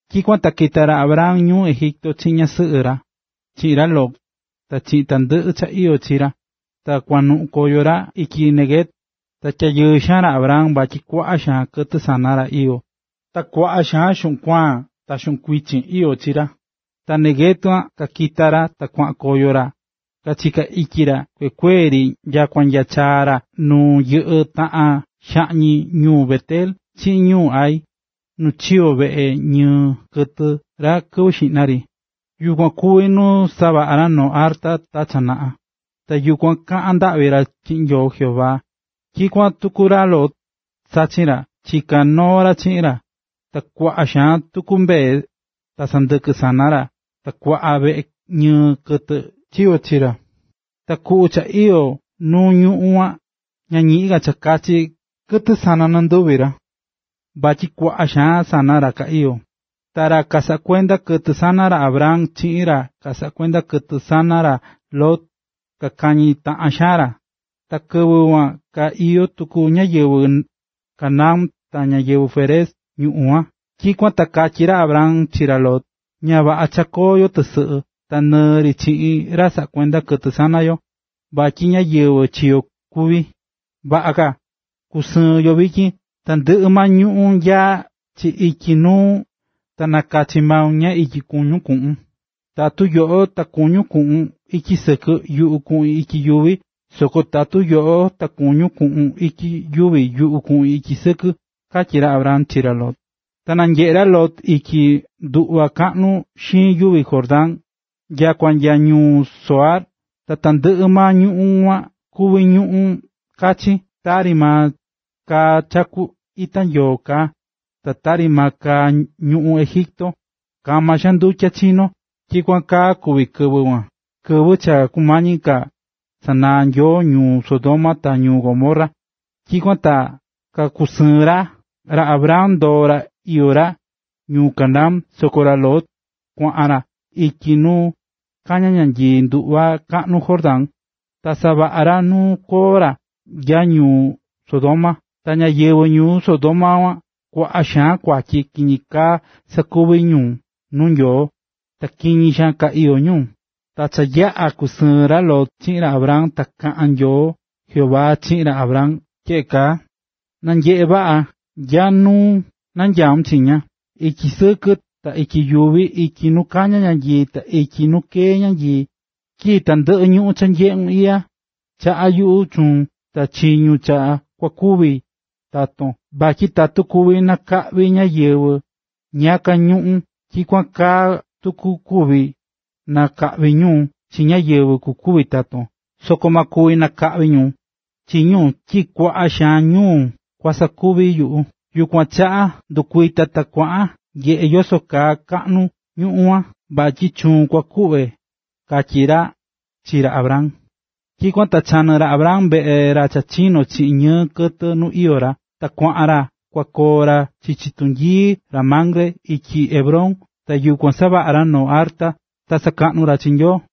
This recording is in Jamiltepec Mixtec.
Tyikuan ta kita̱ ra Abram ñuu Egipto chiꞌin ñasɨꞌɨ ra, chiꞌin ra Lot, ta chiꞌin tandɨꞌɨ cha iyó chi ra, ta kuanuꞌun koyo ra ityi Neguev. Ta tyayɨɨ xaan ra Abram vatyi kuaꞌa xaan kɨtɨ sana ra iyó, ta kuaꞌa xaan xuꞌun kuaan ta xuꞌun kuichin iyó chi ra. Ta nya Neguev kakita̱ ra ta kuaꞌan koyo ra, kachiká ityi ra kuekuee ri nyakua nya chaa̱ ra nu yɨꞌɨ́ taꞌan xaꞌñi ñuu Bet-el chiꞌin ñuu Hai, nu chiyo̱ veꞌe ñɨɨ kɨtɨ ra kɨvɨ xiꞌna ri. Yukuan kuvi̱ nu savaꞌa̱ ra noo arta ta cha naꞌa. Ta yukuan kaꞌa̱n ndaꞌvi ra chiꞌin Nyoo Jehová. Tyikuan tuku ra Lot, sachin ra, chiká noo ra chiꞌin ra. Ta kuaꞌa xaan tuku mbee ta sɨndɨkɨ sana ra ta kuaꞌa veꞌe ñɨɨ kɨtɨ chiyo̱ chi ra. Ta kuꞌu cha iyó nu ñuꞌún kuan, ña ñiꞌin ka cha kakachi kɨtɨ sana nɨnduvi ra, vatyi kuaꞌa xaan sana ra ka iyó. Ta ra kasaꞌá kuenda kɨtɨ sana ra Abram chiꞌin ra kasaꞌá kuenda kɨtɨ sana ra Lot kakañí taꞌan xaan ra. (Ta kɨvɨ kuan ka iyó tuku ñáyɨvɨ Canaán ta ñáyɨvɨ Férez ñuꞌún kuan.) Tyikuan ta katyí ra Abram chi ra Lot: “Ña vaꞌa cha koo yo tɨsɨꞌɨ, ta nɨɨ ri chiꞌin ra saꞌá kuenda kɨtɨ sana yo, vatyi ñáyɨvɨ chi yo kuví. Vaꞌa ka na kusɨɨn yo vityin. Tandɨꞌɨ maa ñuꞌún nyaá chi ityi nuu, ta nakachi maun nya ityi kuñun kuꞌun. Tatu yoꞌo ta kuñún kuꞌun ityi sɨkɨ, yuꞌu kuꞌin ityi yuvi, soko tatu yoꞌo ta kuñún kuꞌun ityi yuvi, yuꞌu kuꞌin ityi sɨkɨ”, katyí ra Abram chi ra Lot. Ta nanyeꞌe̱ ra Lot ityi nduꞌva kaꞌnu xiin yuvi Jordán nyakua nya ñuu Zoar. Ta tandɨꞌɨ maa ñuꞌún kuan kuví ñuꞌún kachin, tari maa kaá chaku tu ita Nyoo kaá, ta tari maa kaá ñuꞌún Egipto, kama xaan ndutya chinó. Tyikuan kaa kuví kɨvɨ kuan, kɨvɨ cha kumañi ka sanaa ra Jehová ñuu Sodoma ta ñuu Gomorra Tyikuan ta kakusɨɨ̱n ra. Ra Abram ndoo̱ ra iyó ra ñuu Canaán. Soko ra Lot kuaꞌan ra ityi nu kañá ñanyii nduꞌva kaꞌnu Jordán, ta savaꞌa̱ ra nu koo ra nya ñuu Sodoma. Ta ñáyɨvɨ ñuu Sodoma kuan kuaꞌa xaan kuatyi kiñi kaa sakuví ñu nuu Nyoo, ta kiñi xaan ka iyó ñu. Ta cha yaꞌa̱ kusɨɨ̱n ra Lot chiꞌin ra Abram, ta kaꞌa̱n Nyoo Jehová chiꞌin ra Abram tyeꞌe kaa: “Na̱nyeꞌe vaꞌa nya nu nanyaún chiña, ityi sɨkɨ ta ityi yuvi, ityi nu kañá ñanyii, ta ityi nu keé ñanyii. Tyi tandɨꞌɨ ñuꞌún cha nyeꞌún iꞌya, chaꞌá yuꞌu chuun ta chi ñu cha kua kuvi taton. Vatyi tatu kuvi nakaꞌvi ñáyɨvɨ ñiyaka ñuꞌún, tyikuan kaa tuku kuvi nakaꞌví ñu chi ñáyɨvɨ kukuvi taton, soko ma kuvi nakaꞌvi ñu chi ñu tyi kuaꞌa xaan ñu kua sakuvi yuꞌu. Yukuan chaꞌa ¡ndɨ̱kuita ta kua nyeꞌe yoso cha kaꞌnu ñuꞌún kuan, vatyi chuun kua kuꞌve!”, katyí ra chi ra Abram. Tyikuan ta chanɨ̱ ra Abram veꞌe ra cha chinó chiꞌin ñɨɨ kɨtɨ nu iyó ra, ta kuaꞌan ra kua koo ra chichi tunyii ra Mamre ityi Hebrón. Ta yukuan savaꞌa̱ ra noo arta ta sakaꞌnu̱ ra chi Nyoo.